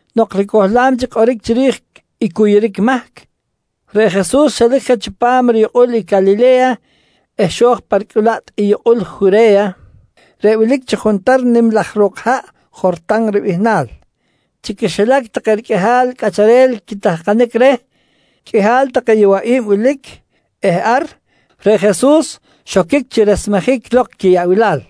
Nok ricohlam chic kꞌoric chiri̱j i cuyuric mahc, reꞌ Jesus xelic je chipam riyukꞌul i Calile̱ya eh xo̱j pa ricꞌulaꞌt i yukꞌul i Jure̱ya reꞌ wilic chi juntar nim laj ro̱k haꞌ Jortan ribihnal. Chi quixilac take riqꞌuihal cꞌacharel quitahkanic reh, qꞌuihal take yowaꞌi̱b wilic eh ar, reꞌ Jesus xoquic chi resmejic lok quiyaꞌbilal.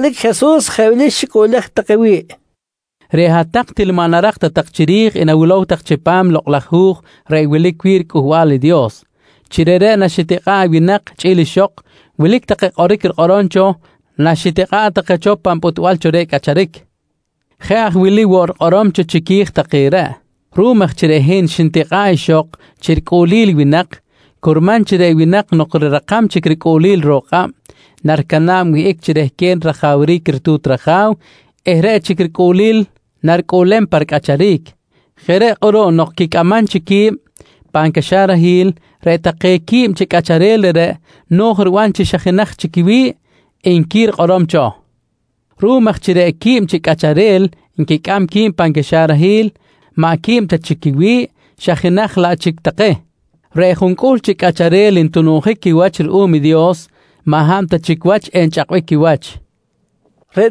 Chalic Jesus jeꞌ wili xicꞌuꞌlej take wi̱ꞌ: «Reꞌ hat-tak til maꞌ narak ta tak chiri̱j i nawilow tak chipam i Lokꞌ laj Hu̱j reꞌ wilic wi̱ꞌ riCꞌuhbal i Dios, chi reꞌreꞌ naxitikꞌa̱ꞌ i winak chꞌi̱l ixok, wilic take kꞌoric rikꞌorom cho naxitikꞌa̱ꞌ take cho pan pꞌutbal cho reh cꞌacharic. Jeꞌ aj wili woꞌ rikꞌorom cho chiqui̱j take reꞌ: ‹Ruꞌum aj chi reꞌ hin xnitikꞌa̱ꞌ ixok chi ricꞌuꞌlil i winak, curman chi reꞌ winak nok rirakam chic ricꞌuꞌlil ro̱k kꞌab, naricana̱b wihꞌic chi rehquen rajawric ritu̱t raja̱w eh reꞌ chic ricꞌuꞌlil naricꞌuꞌlem pa ricꞌacharic. Jeꞌ reꞌ kꞌuruꞌ nok quicꞌamam chic qui̱b pan caxarahil, reꞌ take quib chi cꞌacharel reꞌreꞌ no̱j riban chi xa jenaj chic quiwi̱ꞌ, nqui rikꞌorom cho. «Ruꞌum aj chi reꞌ quib chi cꞌacharel nquicꞌam qui̱b pan caxarahil maꞌ quib ta chic quiwi̱ꞌ xa jenaj laꞌ chic take, reꞌ juncꞌuhl chi cꞌacharel ntununjic quiwach ruꞌum i Dios maꞌ hab ta chic wach enchꞌakbic quiwach, nqui Jesus queh.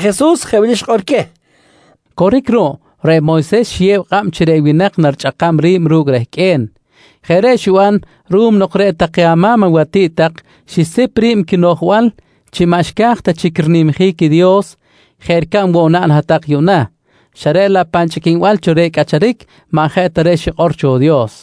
Reꞌ Jesus jeꞌ wili xikꞌor queh: «Coric ruꞌ, reꞌ Moyses xiyew kꞌab chi reꞌ winak narichꞌakam ri̱b ru̱cꞌ rehqꞌue̱n. Jeꞌ reꞌ xiban ruꞌum nok reꞌ take ama̱m awatiꞌt tak xisip ri̱b quinoꞌjbal chi maꞌ xca̱j ta chic rinimjic i Dios jeꞌ ricab woꞌ naꞌn hat-tak yuꞌna, xa reꞌ laꞌ pan chꞌiquinbal cho reh cꞌacharic maꞌ jeꞌ ta reꞌ xikꞌor cho Dios.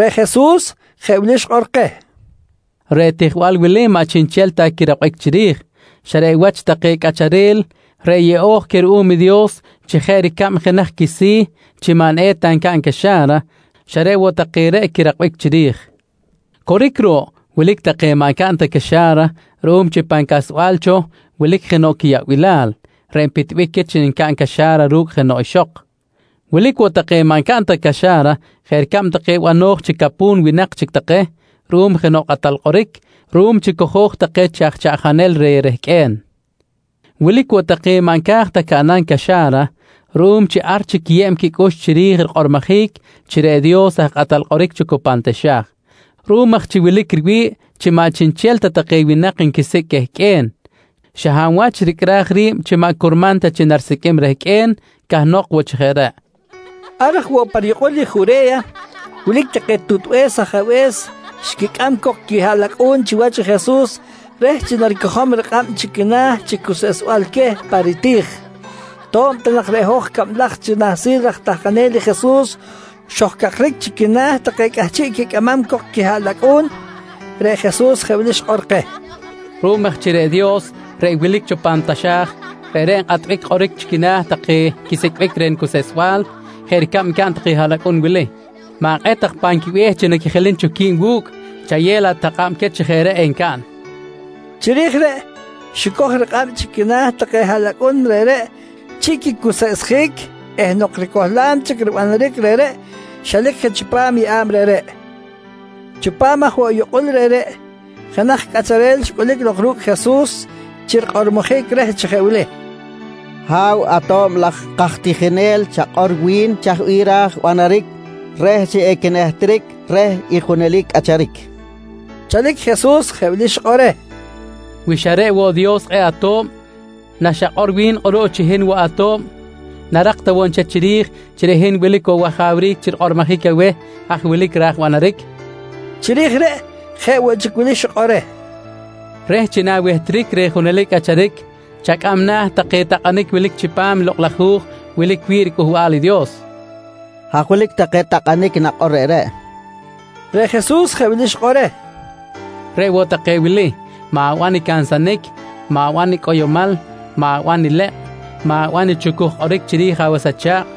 Reꞌ Jesus jeꞌ wili xikꞌor keh: «Reꞌ tijbal wili maꞌ chiꞌnchel ta quirakbic chiri̱j, xa reꞌ wach take cꞌacharel reꞌ yeꞌo̱j queh ruꞌum i Dios chi jeꞌ ricab jenaj quisi̱ chi maꞌ eta ncaꞌn caxa̱ra, xa reꞌ woꞌ take reꞌ quirakbic chiri̱j. Coric ruꞌ, wilic take maꞌ ncaꞌn ta caxa̱ra ruꞌum chi pan casba̱l cho wilic jenoꞌ quiyaꞌbilal reꞌ npitbic queh chi ncaꞌn caxa̱ra ru̱cꞌ jenoꞌ ixok. Wilic woꞌ take maꞌ ncaꞌn ta caxa̱ra jeꞌ ricab take bano̱j chi capu̱n winak chic take ruꞌum jenoꞌ kꞌatal kꞌoric ruꞌum chi cojo̱j take chi aj chaꞌjanel reh rehqꞌue̱n. Wilic woꞌ take maꞌ nca̱j ta caꞌnam caxa̱ra ruꞌum chi ar chic nquiyew quicꞌux chiri̱j rikꞌormojic chi reꞌ Dios aj kꞌatal kꞌoric cho cu pan taxa̱j. Ruꞌum aj chi wilic riwi̱ꞌ chi maꞌ chiꞌnchel ta take winak maꞌ nquisicꞌ ta quehqꞌue̱n, xa hab wach ricꞌraj ri̱b chi maꞌ curman ta chi narisiqꞌuim rehqꞌue̱n, cahnok woꞌ chi jeꞌ reꞌ, nqui Jesus keh. Ar aj woꞌ pa riyukꞌul i Jure̱ya, wilic take tutbe̱s ajabe̱s xquicꞌam cok quihaꞌlacꞌu̱n chiwach i Jesus reh chi naricojom rikꞌab chi quina̱ chi cuseꞌsbal queh pa riti̱j. To̱b ta nak reꞌ hoj cablaj chi nahsil raj tahkanel i Jesus xojcakric chi quina̱ take cꞌahchiꞌ quicꞌamam cok i quihaꞌlacꞌu̱n, reꞌ Jesus jeꞌ wili xikꞌor keh: «Ruꞌum aj chi reꞌ Dios reꞌ wilic cho pan taxa̱j, reꞌreꞌ nkꞌatbic kꞌoric chi quina̱ take quisicꞌbic reh nicuseꞌsbal jeꞌ ricab ncaꞌn take haꞌlacꞌun wili, ma̱kꞌet tak pan quibe̱h take chi naquijilim cho qui̱b wu̱cꞌ, chayew laꞌ tak kꞌab queh chi jeꞌ reꞌ encaꞌn, nqui Jesus keh. Chiri̱j reꞌ xicoj rikꞌab chi quina̱ take haꞌlacꞌun reꞌreꞌ chi quicuseꞌsjic eh nok ricohlam chic ribanaric reꞌreꞌ, xelic je chipam i yeꞌa̱b reꞌreꞌ. Chipam aj woꞌ yukꞌul reꞌreꞌ, jenaj cꞌacharel xcꞌulic lok ru̱cꞌ Jesus chi rikꞌormojic reh chi jeꞌ wili: «Ha̱w ato̱b laj kaj tijinel, chakꞌor wi̱n, chaj bih ra̱j banaric reh chi equinehtric reh i junelic cꞌacharic? nqui reh. Chalic Jesus jeꞌ wili xikꞌor reh: «Wi xa reꞌ woꞌ Dios kꞌe̱ꞌ ato̱b, naxakꞌor wi̱n kꞌuruꞌ chi hin woꞌ ato̱b, narak ta woꞌ nchel chiri̱j chi reꞌ hin wilic woꞌ wajawric chi rikꞌormojic aweh haj wilic ra̱j banaric? nqui reh. Chiri̱j reꞌ jeꞌ woꞌ chic wili xikꞌor reh: «Reh chi na̱wehtric reh i junelic cꞌacharic, chacꞌam na̱ take takꞌanic wilic chipam i Lokꞌ laj Hu̱j wilic chipam riCꞌuhbal i Dios, nqui Jesus. —Haj wilic take takꞌanic nakꞌor reꞌreꞌ, nqui cꞌacharel reꞌreꞌ. Reꞌ Jesus jeꞌ wili xikꞌor reh: «Reꞌ woꞌ take wili: “Ma̱ban i cansanic, ma̱ban i cꞌoyomal, ma̱ban i lekꞌ, ma̱ban i chucuj kꞌoric chiri̱j awas acha̱kꞌ,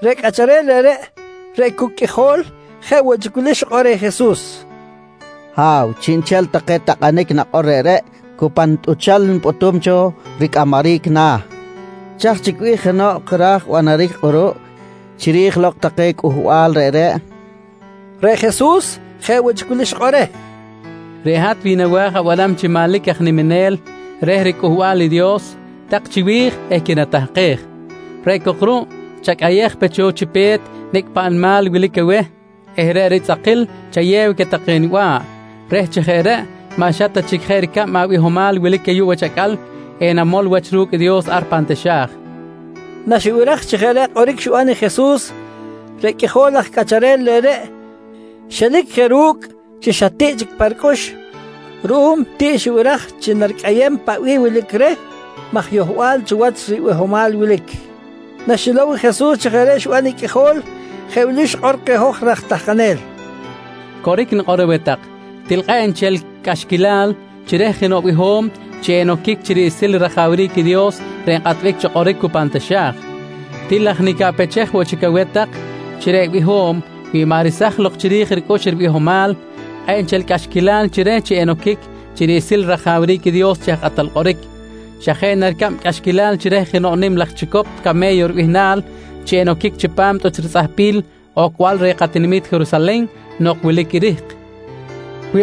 Reꞌ cꞌacharel reꞌreꞌ, reꞌ cu qꞌuijol, jeꞌ woꞌ chic wili xikꞌor reh Jesus: «Ha̱w, chiꞌnchel take takꞌanic nakꞌor reꞌreꞌ cu pa nitꞌuchal nipꞌutum cho ricꞌamaric na̱. Chaj chic bih jenoꞌ ra̱j banaric kꞌuruꞌ chiri̱j lok take cꞌuhbal reꞌreꞌ? nqui reh. Reꞌ Jesus jeꞌ woꞌ chic wili xikꞌor reh: «Reꞌ hat wi nawa̱j abanam chi manlic aj niminel reh riCꞌuhbal i Dios, tak chiwi̱j eh quinatahkej. Reꞌ cok ruꞌ, chacꞌayej pe cho chi pe̱t nicꞌ paꞌ nimal wilic aweh eh reꞌ ritzꞌakil chayew queh take niba̱ꞌ reh chi jeꞌ reꞌ maꞌ xa ta jeꞌ chic ricab abihomal wilic ayuꞌ wach acꞌal enamol wach ru̱cꞌ i Dios ar pan taxa̱j, nqui reh. Naxibiraj chi jeꞌ reꞌ kꞌoric xiban i Jesus, reꞌ qꞌuijol laj cꞌacharel reꞌreꞌ xelic je ru̱cꞌ chi xa tiꞌ chic pa ricꞌux ruꞌum tiꞌ xibiraj chi naricꞌayem paꞌ bih wilic reh maj yohbal cho wach ribihomal wilic. Naxilow i Jesus chi jeꞌ reꞌ xiban i qꞌuijol, jeꞌ wili xikꞌor keh hoj raj tahkanel: «Coric nikꞌor aweh tak, til kꞌe̱ꞌ nchel cꞌaxquilal chi reh jenoꞌ biho̱m chi enoquic chi riꞌsil rajawric i Dios reꞌ nkꞌatbic cho kꞌoric cu pan taxa̱j. Til aj nicaꞌpechej woꞌ chic aweh tak chi reꞌ biho̱m wi maꞌ resaj lok chi ri̱j ricꞌux i ribihomal, kꞌe̱ꞌ nchel cꞌaxquilal chi reh chi enoquic chi riꞌsil rajawric i Dios chi aj kꞌatal kꞌoric. Xa jeꞌ na ricab cꞌaxquilal chi reh jenoꞌ nim laj chicop came̱yo ribihnal chi enoquic chipam tꞌuch ritzꞌahpil ocbal reh katinami̱t Jerusalen nok wilic i rihk, nqui Jesus.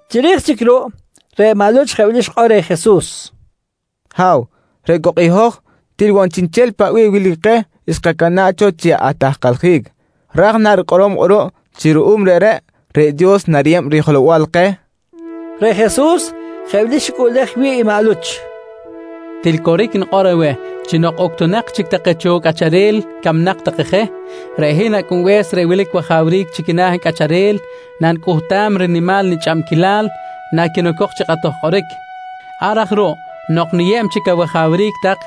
Chiri̱j chic ruꞌ, reꞌ maꞌ Luch jeꞌ wili xikꞌor reh Jesus: «Ha̱w, reꞌ cok i hoj til woꞌ chiꞌnchel paꞌ bih wilic keh xkacana̱ꞌ cho chi atahkaljic. Ra̱j na rikꞌorom kꞌuruꞌ chi ruꞌum reꞌreꞌ, reꞌ Dios nariyeb rijelow-bal keh? nqui reh. Reꞌ Jesus jeꞌ wili xicꞌuꞌlej wi̱ꞌ i maꞌ Luch: «Til coric nikꞌor aweh chi nok uctunak chic take cho cꞌacharel camnak take je, reꞌ hin Acꞌunbe̱s reꞌ wilic wajawric chi quina̱ cꞌacharel nanicꞌuhtam rinimal nichꞌabquilal naquinocok chi kꞌatoj kꞌoric. Ar aj ruꞌ nok niyeb chic awajawric tak,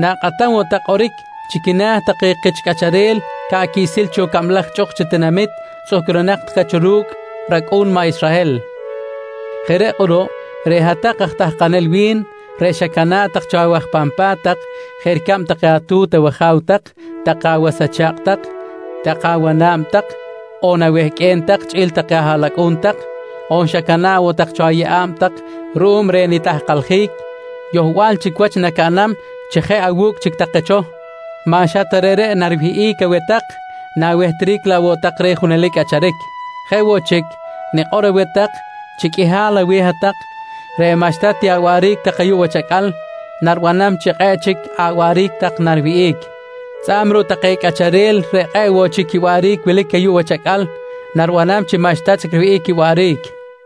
na̱kꞌatam woꞌ tak kꞌoric chi quina̱ take kich cꞌacharel ca̱ꞌ quiꞌsil cho cablaj chꞌuk chi tinamit tzꞌuhcrunak cho cu̱cꞌ take racꞌu̱n maꞌ Israhel. Jeꞌ reꞌ kꞌuruꞌ, reꞌ hat-tak aj tahkanel wi̱n reꞌ xacana̱ꞌ tak cho awaj pan pa̱t tak jeꞌ ricab take atu̱t awaja̱w tak, take awas acha̱kꞌ tak, take awana̱b tak on awehqꞌue̱n tak chꞌi̱l take ahaꞌlacꞌu̱n tak, on xacana̱ꞌ woꞌ tak cho ayeꞌa̱b tak ruꞌum reh nitahkaljic, yohbal chic wach nacaꞌnam chi jeꞌ awu̱cꞌ chic take cho. Maꞌ xa ta reꞌreꞌ nariwihꞌic aweh tak, na̱wehtric laꞌ woꞌ tak reh i junelic cꞌacharic. Jeꞌ woꞌ chic, nikꞌor aweh tak chi qꞌuihal aweh hat-tak reꞌ maꞌxta ti awaꞌric tak ayuꞌ wach acꞌal, naribanam chi kꞌe̱ꞌ chic awaꞌric tak nariwihꞌic. Tzꞌa̱b ruꞌ take cꞌacharel reꞌ kꞌe̱ꞌ woꞌ chic quiwaꞌric wilic ayuꞌ wach acꞌal, naribanam chi maꞌxta chic riwihꞌic quiwaꞌric.